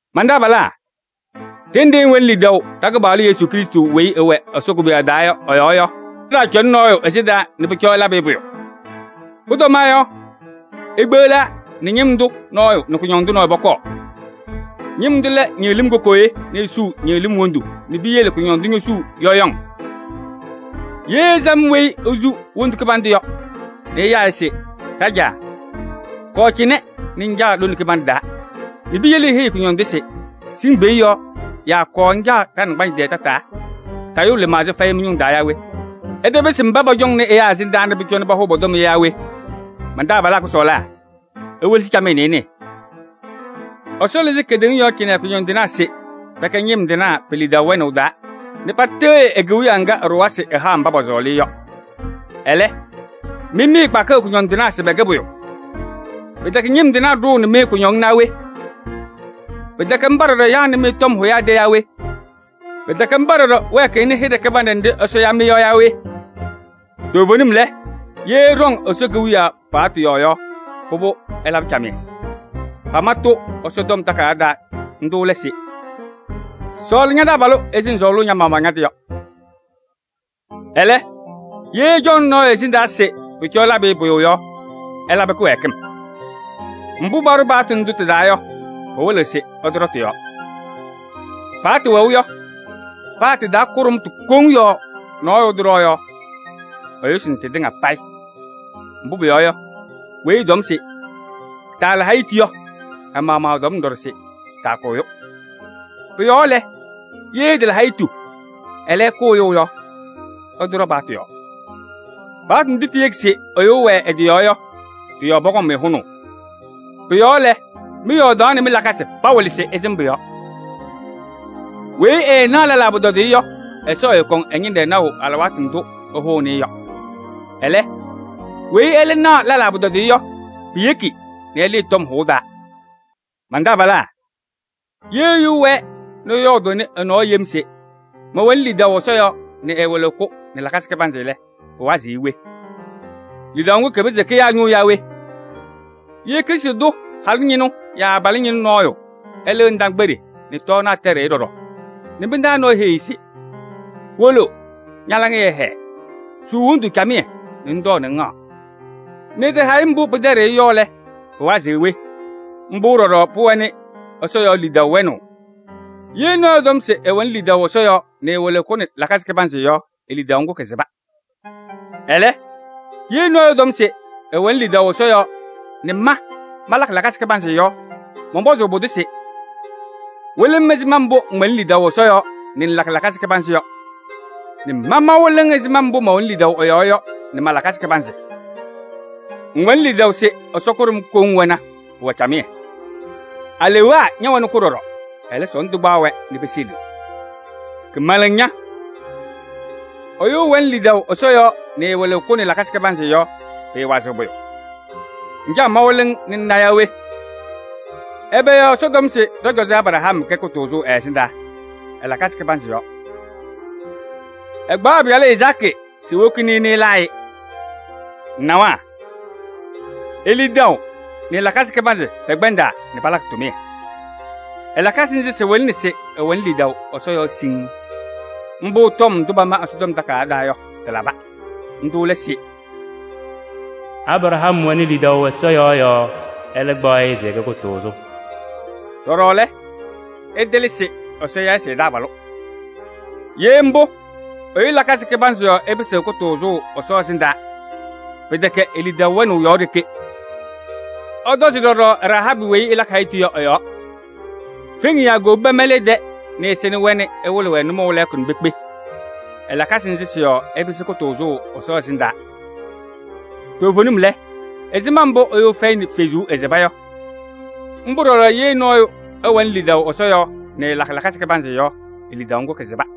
Man-taabalaa! Đenɖe ɩwɛnɩ lidaʋ ɖa-Kɩpaɣlʋ Yesu Krɩstʋ weyi ɛwɛ Ɛsɔ koboyaɣ taa yɔ ɛ-yɔɔ yɔ, ɩtaacɔnɩ nɔɔyʋ ɛsɩndaa nɛ pʋcɔ ɩlabɩ-ɩ pʋyʋ. Pʋtɔma yɔ, ikpeɣlaa nɛ ñɩm tʋ nɔɔyʋ nɛ kʋñɔndʋ nɔɔyʋ pɔkɔɔ. Ñɩm tʋ lɛ ñɩɣlɩ́m kokooye nɛ esuu ñɩɣlɩ́m wondu nɛ piyele kʋñɔndʋ ñosuu cɛkɩŋ. Yee ɩsam weyi esu wondu kɩbandʋ yɔ nɛ ɩyaa-ɩ se: “Đajaa! Kɔɔ cɩnɛ nɛ ŋcaɣ lone kɩbanɖɛ taa” nɛ piyele iheyi kʋñɔndʋ se: “Sɩŋ peeɖe yɔ” yaa: “Kɔɔ ŋcaɣ ɖa-naŋgbanzɩ tɛɛ cɩnɛ tataa” yɔ, tayʋʋ lɩmaɣza fɛyɩ mɩ-maɣmaɣ mɩ-ñʋŋ taa yaa we? Ɩtapɩsɩ mbá pɔcɔŋnɩ ɛyáa ɛsɩndaa nɛ pʋcɔ pahʋʋ tɔm yɔ yaa we? Man-taabalaa kʋsɔɔlaa! Iwelesi camɩyɛ nɛ ɩnɩɩ: Ɛsɔ lɩzɩ kedeŋa yɔɔ cɩnɛ kʋñɔndɩnaa se pɛkɛ ñɩm tɩnaa pe-lidaʋ wɛnaʋ taa nɛ patɩɣyɩ e-Kewiyaɣ ŋgá ɛɖʋwa se ɛhaɣ mbá pɔsɔɔlɩ-ɩ yɔ. Ɛlɛ́, mɩ mɩɩkpakɩɣ kʋñɔndɩnaa se pɛkɛ pʋyʋ! Pɩtɛkɛ ñɩm tɩnaa ɖʋʋnɩ-mɩ kʋñɔŋ naa we? Pɩtɛkɛ ḿbá ɖɔɖɔ yaɣnɩ-mɩ tɔm hʋyaa tɛ yaa we? Pɩtɛkɛ ḿbá ɖɔɖɔ wɛɛkɩɣnɩ hɩɖɛ kɩbanɖɛ nɖɩ́ Ɛsɔ ya-mɩ yɔ yaa we? Toovenim lɛ, yee ɩɖɔŋ Ɛsɔ Kewiyaɣ paɣtʋ yɔɔ yɔ, pʋbʋ, ɩlabɩ camɩyɛ. Pama-tʋ Ɛsɔtɔm Takayaɣ taa, ńdʋ́ lɛ se: “Sɔɔlɩ ña-taabalʋ ɛzɩ ŋsɔɔlʋʋ ña-maɣmaɣ ña-tɩ yɔ.” Ɛlɛ́, yee ɩcɔŋnɩ nɔɔyʋ ɛsɩndaa se pʋcɔ ɩlabɩ-ɩ pʋyʋ yɔ, ɩlabɩ kɩwɛɛkɩm. Mbʋ́ paɖʋ paɣtʋ ńdʋ́ tɩ-taa yɔ, pɩwɩlɩɣ se ɩtɔɖɔ tɩ-yɔɔ. Paɣtʋ wɛʋ yɔ, paa tɩ-taa kʋɖʋmtʋ koŋ yɔɔ nɔɔyʋ ɛtɔɖɔ yɔ, ɛyʋsɩnɩ tɩtɩŋa payɩ. Mbʋ́ pʋyɔɔ yɔ, weyi ɛtɔm se: “Taala hayitu” yɔ, ɛ-maɣmaɣ ɛtɔmna ɖɔɖɔ se: “Taakʋ ɛyʋ.” Pʋ-yɔɔ lɛ, yee ɩtala hayitu, ɛlɛ́, ɩkʋ ɛyʋ yɔ, ɩtɔɖɔ paɣtʋ yɔɔ. Paɣtʋ ndʋ́ tiyeki se ɛyʋ ɛwɛɛ ɛ-tɩ yɔɔ yɔ, tɩ-yɔɔ pɔkɔŋ-mɩ hʋnaʋ. Pʋ-yɔɔ lɛ, mɩ-yɔɔdaɣ nɛ mɩ-lakasɩ pawɩlɩ se ɩsɩm paɣtʋ ńdʋ́. Weyi ɛɛnaɣ lɛlaa pʋtɔdɩyɛ yɔ, Ɛsɔ ɛɛkɔŋ ɛ-ñɩnɖɛ naʋ ɖɔɖɔ alɩwaatʋ ndʋ́ ɛhʋʋnɩ-ɩ yɔ. Ɛlɛ́, weyi ɛ́lɛ́ naɣ lɛlaa pʋtɔdɩyɛ yɔ, piyeki nɛ ɛlɩɩ tɔm hʋʋ taa. Man-taabalaa! Yee ɛyʋ ɛwɛɛ nɛ ɛyɔɔdʋʋnɩ nɔɔ yem se: “Mɛwɛnɩ lidaʋ Ɛsɔ yɔɔ” nɛ ɛɛwɩlɩɣ-kʋ nɛ lakasɩ kɩbanzɩ lɛ, pɩwazɩɣ-ɩ we? Lidaʋ ŋ́gʋ́ kɩpɩzɩɣ kɩya ɛ-ñʋʋ naa we? Yee Krɩstʋ tʋ halʋ ñɩnʋ yaa abalʋ ñɩnʋ nɔɔyʋ ɛlɩɣ ndaakpeɖe nɛ tɔɔnaɣ tɛɖɩɣ-ɩ ɖɔɖɔ nɛ mɩ-taa nɔɔyʋ heyi-i se: “Wolo, ña-laŋɩyɛ ɛhɛɛ, suu wondu camɩyɛ nɛ ŋtɔɔ nɛ ŋhaɣ!” Nɛ ɛtaha-ɩ mbʋ́ pɩtɛɖɩɣ-ɩ yɔ lɛ, pɩwazɩɣ we? Ḿbʋ́ ɖɔɖɔ pʋwɛnɩ Ɛsɔ yɔɔ lidaʋ wɛnaʋ: yee nɔɔyʋ ɛtɔm se ɛwɛnɩ lidaʋ Ɛsɔ yɔɔ nɛ ɛɛwɩlɩɣ-kʋ nɛ lakasɩ kɩbanzɩ yɔ, e-lidaʋ ŋ́gʋ́ kɩsɩba. Ɛlɛ́, yee nɔɔyʋ ɛtɔm se: “ɛwɛnɩ lidaʋ Ɛsɔ yɔɔ nɛ ma malakɩ lakasɩ kɩbanzɩ yɔ” mɔnpɔzʋʋ pʋdʋ se: “Wɩlɩ-m ɛzɩma mbʋ́ ŋwɛnɩ lidaʋ Ɛsɔ yɔɔ nɛ ŋŋlakɩ lakasɩ kɩbanzɩ yɔ nɛ ma mawɩlɩ-ŋ ɛzɩma mbʋ́ mɛwɛnɩ lidaʋ ɛ-yɔɔ yɔ nɛ ma-lakasɩ kɩbanzɩ yɔ.” Ŋwɛnɩ lidaʋ se Ɛsɔ kʋɖʋm koŋ wɛna, pʋwɛ camɩyɛ. Aleewaa ñɛwɛnɩ-kʋ ɖɔɖɔ, ɛlɛ́ sɔɔndʋ kpaɣ-wɛ nɛ peseliɣ. Kɩmɛlɛŋ ña! Ɛyʋ ɛwɛnɩ lidaʋ Ɛsɔ yɔɔ nɛ ɛɛwɩlɩɣ-kʋ nɛ ɛ-lakasɩ kɩbanzɩ yɔ, pɩɩwazɩɣ pʋyʋ. Ŋcaɣ mawɩlɩ-ŋ nɛ ŋna yaa we? Ɛbɛ yɔɔ Ɛsɔ tɔm se ɖɔ-cɔzɔ Abraham kɛ kʋtʋʋzʋ ɛ-ɛsɩndaa? Ɛ-lakasɩ kɩbanzɩ yɔɔ: ɛkpaɣ ɛ-pɩyalʋ Izaakɩ se ewokini-i nɛ ɛlaa-ɩ-ɩ. Ŋnawa: e-lidaʋ nɛ ɛ-lakasɩ kɩbanzɩ pɛkpɛndaa nɛ palakɩ tʋmɩyɛ. Ɛ-lakasɩ ńzɩ́ sɩwɩlɩnɩ se ɛwɛnɩ lidaʋ Ɛsɔ yɔɔ siŋŋ. Ḿbʋ́ tɔm ndʋ́ pama Ɛsɔtɔm Takayaɣ taa yɔ, tɩlaba. Ńdʋ́ lɛ se: “Abraham wɛnɩ lidaʋ Ɛsɔ yɔɔ yɔɔ, ɛ́lɛ́ kpaɣ-ɩ se ɛkɛ kʋtʋʋzʋ.” Đɔɖɔ lɛ, ɩtɩlɩ se Ɛsɔ ya-ɩ se ɛ-taabalʋ. Yee ḿbʋ́, ɛyʋ lakasɩ kɩbanzɩ yɔɔ ɛpɩsɩɣ kʋtʋʋzʋ Ɛsɔ ɛsɩndaa, pɩtɛkɛ e-lidaʋ wɛnaʋ yɔɔ ɖeke. Ɩtɔzɩ ɖɔɖɔ Rahaabɩ weyi ɛpɛdɩɣ ɛ-tɩ yɔ ɛ-yɔɔ. Feŋiyaa kowobi pɛmɛlɩ ɛ-tɛ nɛ ɛsɩnɩ-wɛ nɛ ɛwɩlɩ-wɛ nʋmɔʋ lɛɛkʋ nɛ pekpe. Ɛ-lakasɩ ńzɩ́ sɩ-yɔɔ ɛpɩsɩ kʋtʋʋzʋ Ɛsɔ ɛsɩndaa. Toovenim lɛ, ɛzɩma mbʋ́ ɛyʋ ɛfɛyɩnɩ fezuu, ɛsɩba yɔ, ḿbʋ́ ɖɔɖɔ yee nɔɔyʋ ɛwɛnɩ lidaʋ Ɛsɔ yɔɔ nɛ ɛɛlakɩ lakasɩ kɩbanzɩ yɔ, e-lidaʋ ŋ́gʋ́ kɩsɩba.